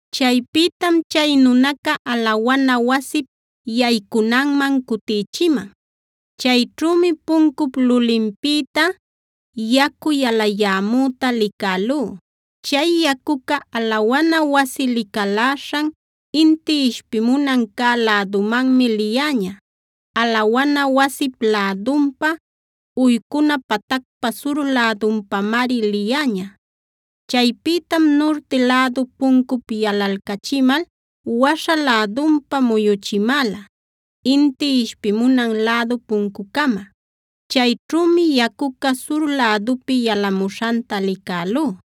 Chaypïtam chay nunaca alawana wasip yaycunanman cutïchiman. Chayćhümi puncup lulinpïta yacu yalayämüta licälú. Chay yacuca alawana wasi licaläśhan, inti ishpimunan cä lädumanmi liyäña; alawana wasip lädunpa, uycuna patacpa sur lädunpamari liyäña. Chaypïtam nurti lädu puncup yalalcachimal waśha lädunpa muyuchimäla inti ishpimunan lädu puncucama. Chayćhümi yacuca sur lädupi yalamuśhanta licälú.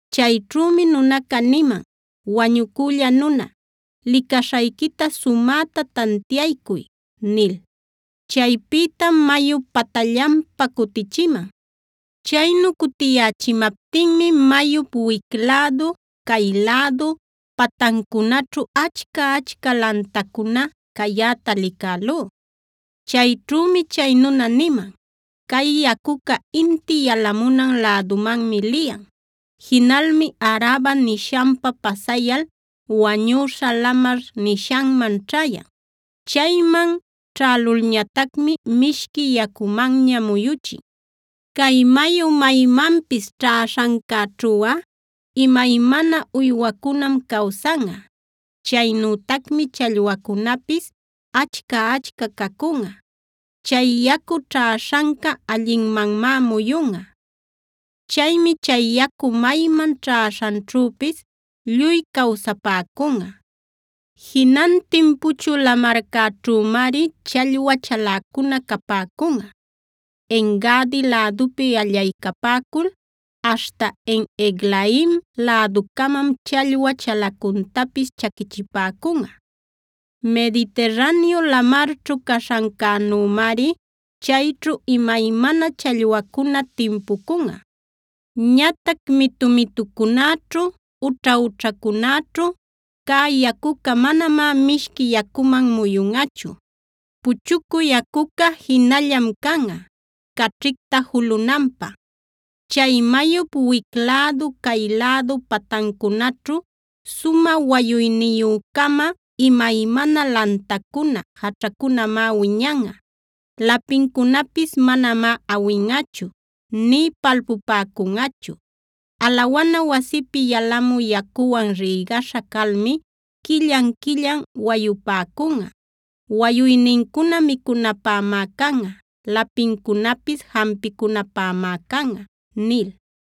Chayćhümi nunaca niman: “Wañucülla nuna, licaśhayquita sumäta tantiaycuy”a nil. Chaypïtam mayup patallanpa cutichiman. Chaynu cutiyächimaptinmi mayup wic lädu, cay lädu patancunaćhu achca-achca lantacuna cayäta licälú. Chayćhümi chay nuna niman: “Cay yacuca inti yalamunan lädumanmi liyan. Jinalmi Araba nishanpa pasayal Wañüśha Lamar nishanman ćhäyan. Chayman ćhälulñatacmi mishqui yacumanña muyuchin. Cay mayu maymanpis ćhäśhancäćhuꞌa imaymana uywacunam cawsanꞌa. Chaynütacmi challwacunapis achca-achca cacunꞌa. Chay yacu ćhäśhanca allinmanmá muyunꞌa. Chaymi chay yacu mayman ćhäśhanćhüpis lluy cawsapäcunꞌa. Jinantin Puchü Lamarcäćhümari challwa chaläcuna capäcunꞌa; En-gadi lädupi allaycapäcul aśhta En-eglaim läducamam challwa chalacuntapis chaquichipäcunꞌa. Mediterraneo lamarćhu caśhancänümari chayćhu imaymana challwacuna timpucunꞌa. Ñatac mitu-mitucunäćhu, ućha-ućhacunäćhu cä yacuca manamá mishqui yacuman muyunꞌachu. Puchucü yacuca jinallam canꞌa, caćhicta julunanpä. Chay mayup wic lädu, cay lädu patancunaćhu sumä wayuyniyü-cama imaymana lantacuna, jaćhacunamá wiñanꞌa. Lapincunapis manamá awinꞌachu, nï palpupäcunꞌachu. Alawana wasipi yalamü yacuwan rïgaśha calmi quillan-quillan wayupäcunꞌa. Wayuynincuna micunapämá canꞌa; lapincunapis jampicunapämá canꞌa” nil.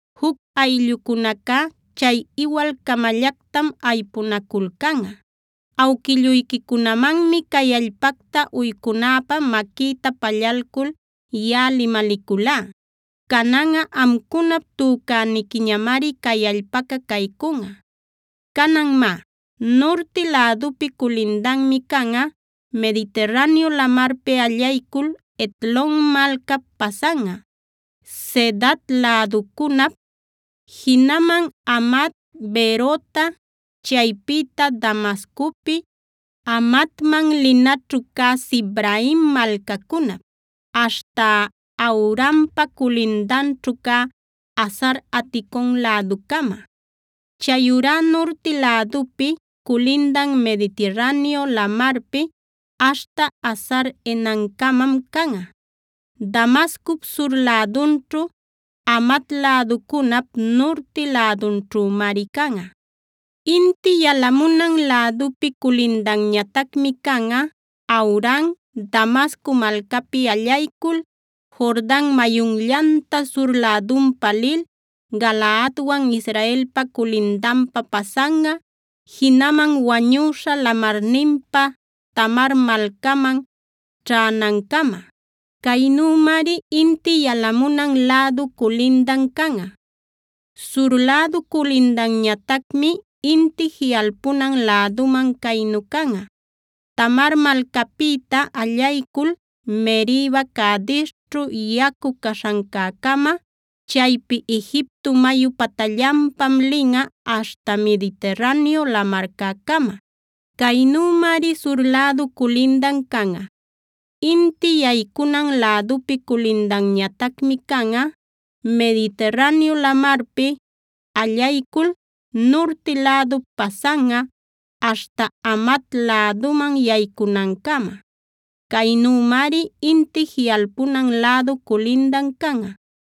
Juc ayllucunacá chay iwal-camallactam aypunaculcanꞌa. Awquilluyquicunamanmi cay allpacta uycunäpä maquïta pallalcul yaꞌa limaliculá. Cananꞌa amcunap tücäniquiñamari cay allpaca caycunꞌa. “Canan má, nurti lädupi culindanmi canꞌa: Mediterraneo Lamarpi allaycul Hetlon malcap pasanꞌa, Zedad läducunap, jinaman Hamat, Berota, chaypïta Damascopi Hamatman linaćhu cä Sibraim malcacunap, aśhta Hauranpa culindanćhu cä Hazar-aticon läducama. Chayurá nurti lädupi culindan Mediterraneo Lamarpi aśhta Hazar-enancamam canꞌa; Damascup sur lädunćhu, Hamat läducunap nurti lädunćhümari canꞌa. “Inti yalamunan lädupi culindanñatacmi canꞌa: Hauran, Damasco malcapi allaycul, Jordan mayunllanta sur lädunpa lil, Galaadwan Israelpa culindanpa pasanꞌa, jinaman Wañüśha Lamarninpa Tamar malcaman ćhänancama. Caynümari inti yalamunan lädu culindan canꞌa. “Sur lädu culindanñatacmi inti jiꞌalpunan läduman caynu canꞌa: Tamar malcapïta allaycul Meriba-Cadesćhu yacu caśhancäcama; chaypi Egipto mayu patallanpam linꞌa aśhta Mediterraneo Lamarcäcama. Caynümari sur lädu culindan canꞌa. “Inti yaycunan lädupi culindanñatacmi canꞌa: Mediterraneo Lamarpi allaycul nurti lädup pasanꞌa aśhta Hamat läduman yaycunancama. Caynümari inti jiꞌalpunan lädu culindan canꞌa.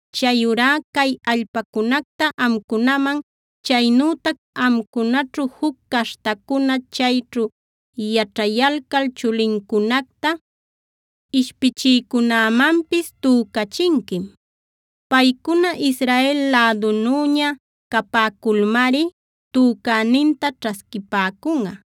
Chayurá cay allpacunacta amcunaman, chaynütac amcunaćhu juc caśhtacuna chayćhu yaćhayalcal chulincunacta ishpichïcunämanpis tücachinquim. Paycuna Israel lädunüña capäculmari tücäninta ćhasquipäcunꞌa.